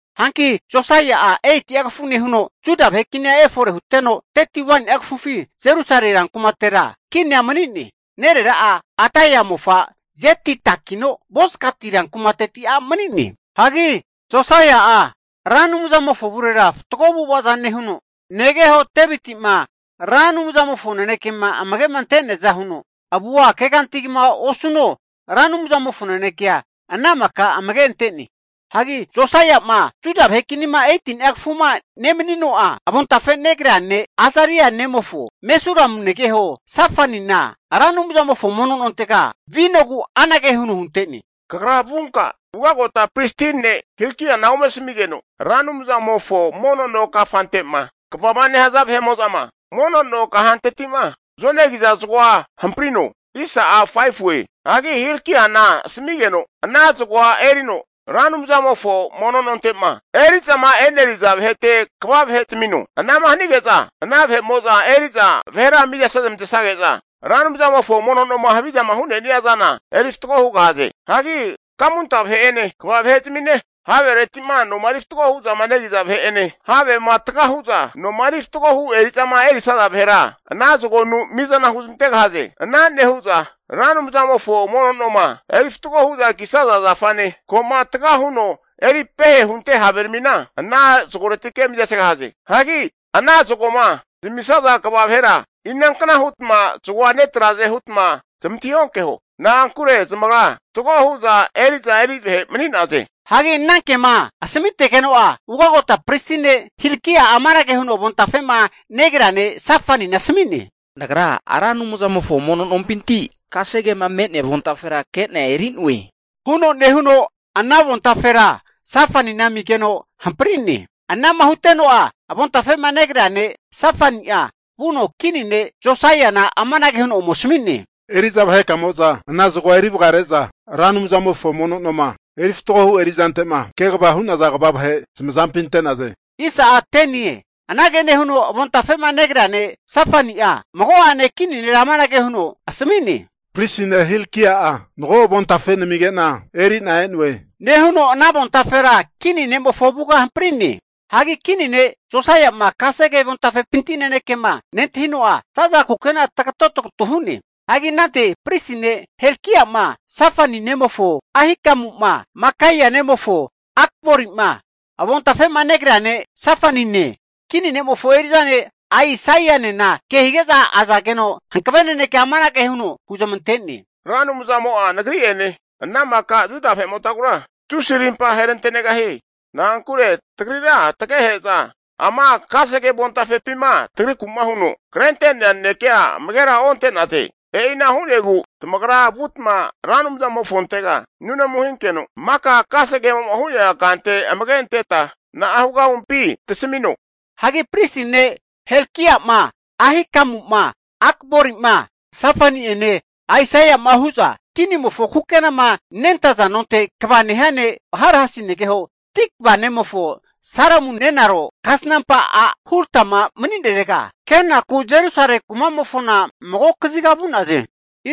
Hanki Josaia'a 8'a kafu nehuno, Juda vahe kini efore huteno, 31ni'a kafufi Jerusalemi rankumatera kinia mani'ne. Nerera'a Adaia mofa, Jedidakino Bozkati rankumateti a' mani'ne. Hagi Josaia'a Ra Anumzamofo avurera fatgo avu'avaza nehuno, negeho Deviti'ma Ra Anumzamofo nanekema amage'ma ante'neaza huno, avua keganti kegma osuno, Ra Anumzamofo nanekea ana maka amage ante'ne. Hagi Josaia'ma Juda vahe kinima 18ni'a kafuma nemanino'a, avontafe negrea ne' Azaria nemofo, Mesulamu negeho Safanina, Ra Anumzamofo mono nontega vinogu anage huno hunte'ne, Kagra vunka ugagota pristi ne' Hilkiana ome asamigeno, Ra Anumzamofo mono no kafante'ma kvama nehaza vahe'mo'zama mono no kahanteti'ma zonegiza zagoa hamprino. Hagi Hilkiana asamigeno ana zagoa erino, Ra Anumzamofo mono nonte'ma eri'zama eneriza vahete kva vahe zamino. Anama hani'ge'za ana vahe'mo'za eri'za vahera miza senezmantesage'za Ra Anumzamofo mono noma havizama hu'nenia zana eri fatgo hugahaze. Hagi kamunta vahe'ene kva vahe'zamine, havereti'ma noma eri fatgoma hu'za negiza vahe'ene, havema taga hu'za noma eri fatgohu eri'zama erisaza vahera, ana zagonu mi'zana huzmantegahaze. Ana nehu'za Ra Anumzamofo mono noma eri fatgo hu'za kisaza zafane, ko'ma taga huno eri pehe hunte haveramina ana zagoretike mizasegahaze. Hagi ana zagoma zamisaza kva vahera, inankna hutma zagoa netraze hutma zamantahi onkeho. Na'ankure zamagra fatgo hu'za eri'za eri vahe mani'naze. Hagi anankema asamitegeno'a, ugagota pristi ne' Hilkia'a amanage huno avontafe'ma negrea ne' Safanina asami'ne, Nagra Ra Anumzamofo mono nompinti kasegema me'nea avontafera kena eri'noe, huno nehuno ana avontafera Safanina amigeno hampri'ne. Anama huteno'a avontafe'ma negrea ne' Safani'a vuno kini ne' Josaiana amanage huno ome asami'ne, Eri'za vahekamo'za ana zagoa eri vgrare'za Ra Anumzamofo mono noma eri fatgo hu erizante'ma kegava hu'naza kva vahe zamazampi ante'naze. Anage nehuno avontafe'ma negrea ne' Safani'a mago'ane kini nera amanage huno asami'ne, Pristi ne' Hilkia'a mago avontafe namige'na eri'na e'noe, nehuno ana avontafera kini ne'mofo avuga hampri'ne. Hagi kini ne' Josaia'ma kasege avontafepinti nanekema nentahino'a, zaza kukena'a tagato tagutu hu'ne. Hagi anante Pristi ne' Hilkiama, Safani nemofo Ahikamuma, Makaia nemofo Akborima, avontafe'ma negrea ne' Safanine, kini ne'mofo eri'za ne' Aisaianena kehige'za azageno hankave nanekea amanage huno huzmante'ne. Ra Anumzamo'a nagri'ene ana maka Juda vahe'motagura tusi arimpa aherante'negahie. Na'ankure tagrira tagehe'za ama kasege avontafepima tagriku'ma huno krente'nea nanekea amagera onte'naze. E'ina hu'negu tamagra vutma Ra Anumzamofontega nunamu hinkeno, maka kasegemo hu'nea kante amage anteta na'a hugahumpi tasamino. Hagi pristi ne' Hilkia'ma, Ahikamu'ma, Akbori'ma, Safani'ene Asaia'ma hu'za, kinimofo kukenama nentaza nonte kva nehia ne' Harhasi negeho Tikva nemofo Salumu nenaro kasnampa a' Hulda'ma mani'nerega, kenaku Jerusalemi kumamofona mago kaziga vu'naze.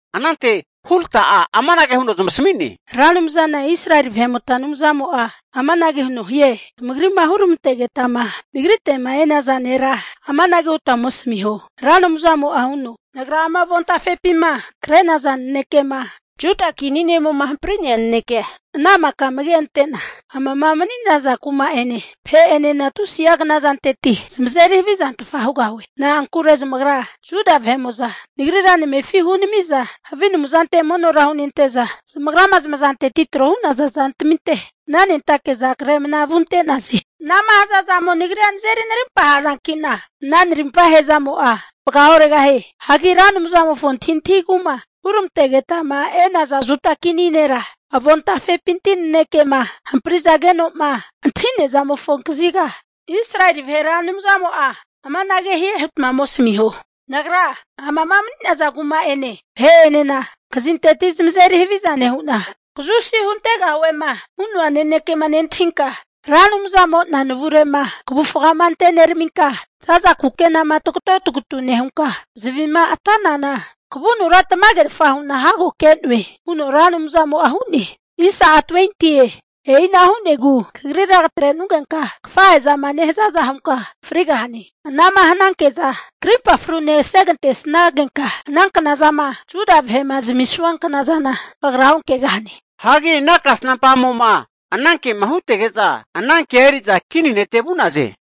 Anante Hulda'a amanage huno zamasami'ne, Ra Anumzana Israeli vahe'mota Anumzamo'a amanage huno hie. Tamagri'ma huramantegetama nagrite'ma e'naza nera amanage hutma ome asamiho, Ra Anumzamo'a huno, Nagra ama avontafepima kre'naza nanekema Juda kini ne'mo'ma hampri'nea nanekea, ana maka amage ante'na, amama mani'naza kuma'ene, vahe'enena tusi'a knazanteti zamazeri havizantfa hugahue. Na'ankure zamagra Juda vahe'mo'za Nagrira zamefi hunami'za, havi anumzante monora hunente'za, zamagrama zamazanteti tro hu'naza zantaminte mnanentake'za kre mna vunte'naze. Anama hazazamo nazeri narimpa hazankino, ana narimpa ahezamo'a vagaoregahie. Hagi Ra Anumzamofo antahintahigu'ma huramantegetama e'naza Juda kini nera, avontafepinti nanekema hamparizageno'ma antahi'nea zamofo kaziga, Israeli vahe Ra Anumzamo'a amanage hie hutma ome asamiho. Nagra amama mani'naza kuma'ene vahe'enena, knazanteti zamazeri haviza nehu'na, kazusi huntegahuema hu'noa nanekema nentahinka, Ra Anumzamo'na navure'ma kavufga anteneraminka, zaza kukenakama tagato tagutu nehunka zavi'ma ate'nana kavunura tamagerfa hu'na hago ke'noe huno Ra Anumzamo'a hu'ne. E'ina hu'negu kagrira katrenugenka kafahe'zama nehazaza hunka frigahane. Anama hananke'za karimpa frune asegantesnagenka, ana knazama Juda vahe'ma zamisua knazana kagra onkegahane. Hagi ana kasnampa a'mo'ma anankema hutege'za, anankea eri'za kini nete vu'naze.